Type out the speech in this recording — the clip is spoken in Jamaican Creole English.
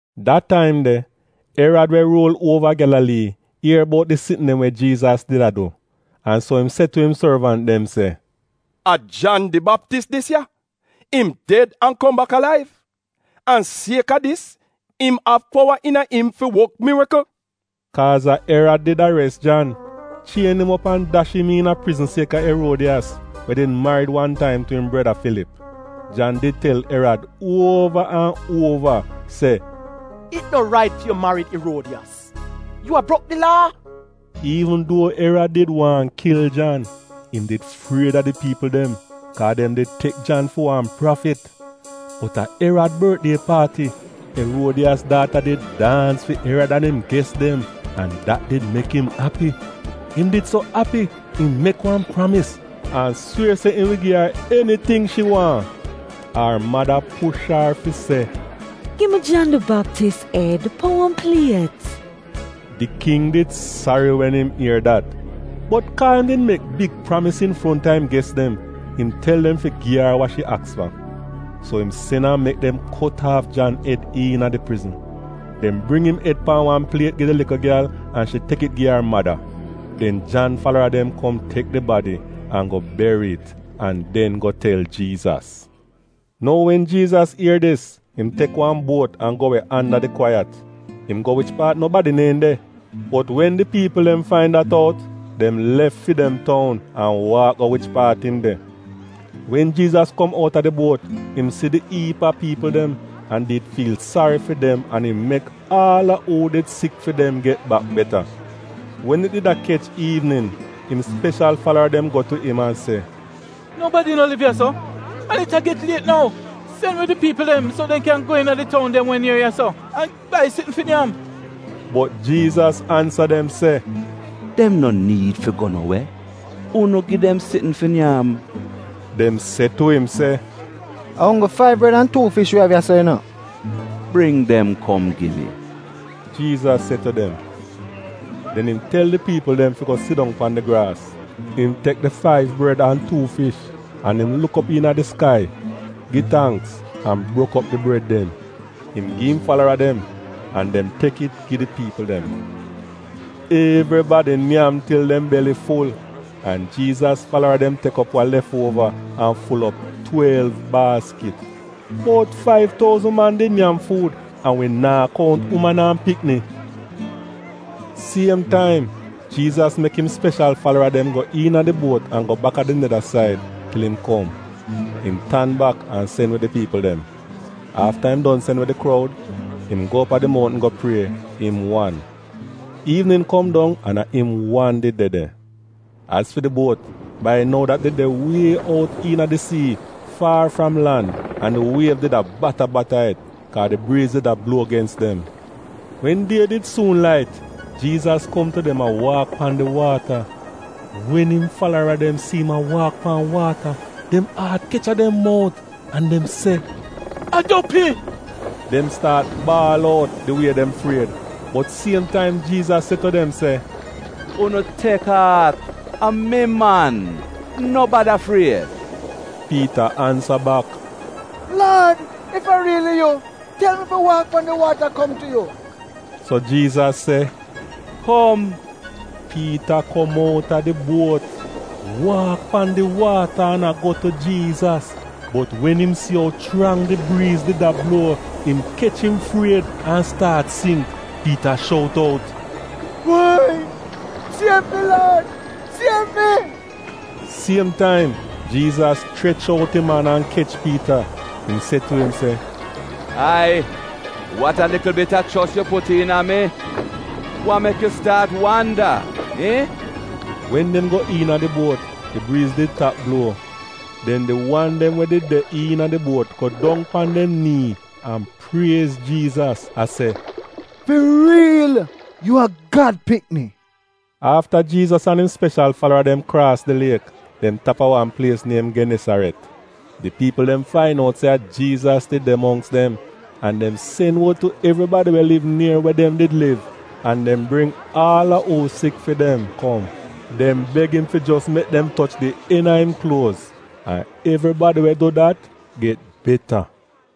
Da taim de, Erad we ruul uova Gyalalii, ier bout di sitn dem we Jiizas did a du, an so im se tu im sorvant dem se, “A Jan di Baptis dis ya. Im ded an kom bak alaiv! An sieka dis, im av powa iina im fi wok mirikl.” Kaaz a Erad did ares Jan, chien im op an dash im iina prizn sieka Eruodiyas, we did marid wan taim tu im breda, Filip. Jan did tel Erad uova an uova se, “It no rait fi yu marid Eruodiyas — yu a brok di Laa.” Iivn duo Erad did waahn kil Jan, im did fried a di piipl dem, kaa dem did tek Jan fi wan prafit. Bot a Erad bortdie paati, Eruodiyas daata did daans fi Erad an im ges dem an dat did mek im api. Im did so api im mek wan pramis, an swier se im wi gi ar eniting shi waahn. Ar mada push ar fi se, “Gi mi Jan di Baptis ed pan wan pliet!” Di king did sari wen im ier dat, bot kaa im did mek big pramis infronta im ges dem, im tel dem fi gi ar wa shi aks fa. So im sen an mek dem kot aaf Jan ed iina di prizn. Dem bring im ed pan wan pliet gi di likl gyal an shi tek it gi ar mada. Den Jan falara dem kom tek di badi an go beri it an den go tel Jiizas. Nou wen Jiizas ier dis im tek wan buot an go we anda di kwaiyat. Im go wich paat nobadi neehn de. Bot wen di piipl dem fain dat out, dem lef fi dem toun an waak go wich paat im de. Wen Jiizas kom outa di buot, im si di iip a piipl dem, an did fiil sari fi dem an im mek aal a uu did sik fi dem get bak beta. Wen it did a kech iivnin, im speshal falara dem go tu im an se, “Nobadi no liv ya-so an it a get liet nou. Sen we di piipl dem so dem kyan go iina di toun dem we nier ya-so an bai sitn fi nyam.” Bot Jiizas ansa dem se, “Dem no niid fi go no we. Unu gi dem sitn fi nyam!” Dem se tu im se, “A onggl faiv bred an tuu fish wi av ya-so yu no.” “Bring dem kom gi mi,” Jiizas se tu dem. Den im tel di piipl dem fi go sidong pan di graas. Im tek di faiv bred an tuu fish an im luk op iina di skai, gi tangks an brok op di bred dem. Im gi im falara dem, an dem tek it gi di piipl dem. Evribadi nyam til dem beli ful, an Jiizas falara dem tek op wa lef uova an ful op twelv baaskit. Bout faiv touzn man did nyam fuud, an wi naa kount uman an pikni. Siem taim, Jiizas mek im speshal falara dem go iina di buot an go bak a di neda said til im kom. Im tan bak an sen we di piipl dem. Afta im don sen we di kroud, im go op a di mountn go prie, im wan. Iivnin kom dong an a im wan did de de. Az fi di buot, bai nou dat did de wie out iina di sii, faar fram lan an di wiev did a bata-bata it, kaa di briiz did a bluo gens dem. Wen die did suun lait, Jiizas kom tu dem a waak pan di waata. Wen im falara dem si im a waak pan waata, dem aat kech a dem mout an dem se, “A dopi!” Dem staat baal out di wie dem fried. Bot siem taim Jiizas se tu dem se, “Unu tek aat! A mi, man. No bada fried.” Piita ansa bak, “Laad, ef a riili yu, tel mi fi waak pan di waata kom tu yu.” So Jiizas se, “Kom!” Piita kom outa di buot, waak pan di waata an a go tu Jiizas. Bot wen im si ou chrang di briiz did a bluo, im kech im fried an staat singk. Piita shout out, “Woi! Siev mi Laad! Siev mi!” Siem taim, Jiizas chrech out im an an kech Piita. Im se tu im se, “Ai, wat a likl bit a chos yu put iina mi! Wa mek yu staat wanda, iihn?” Wen dem go iina di buot di briiz did tap bluo. Den di wan dem we did de iina di buot go dong pan dem nii an priez Jiizas a se, “Fi riil, yu a Gad pikni!” Afta Jiizas an im speshal falara dem kraas di liek, dem tap a wan plies niem Genesaret. Di piipl dem fain out se a Jiizas did de mongks dem, an dem sen wod tu evribadi we liv nier we dem did liv, an dem bring aal a uu sik fi dem kom. Dem beg im fi jos mek dem toch di en a im kluoz, an evribadi we du dat get beta.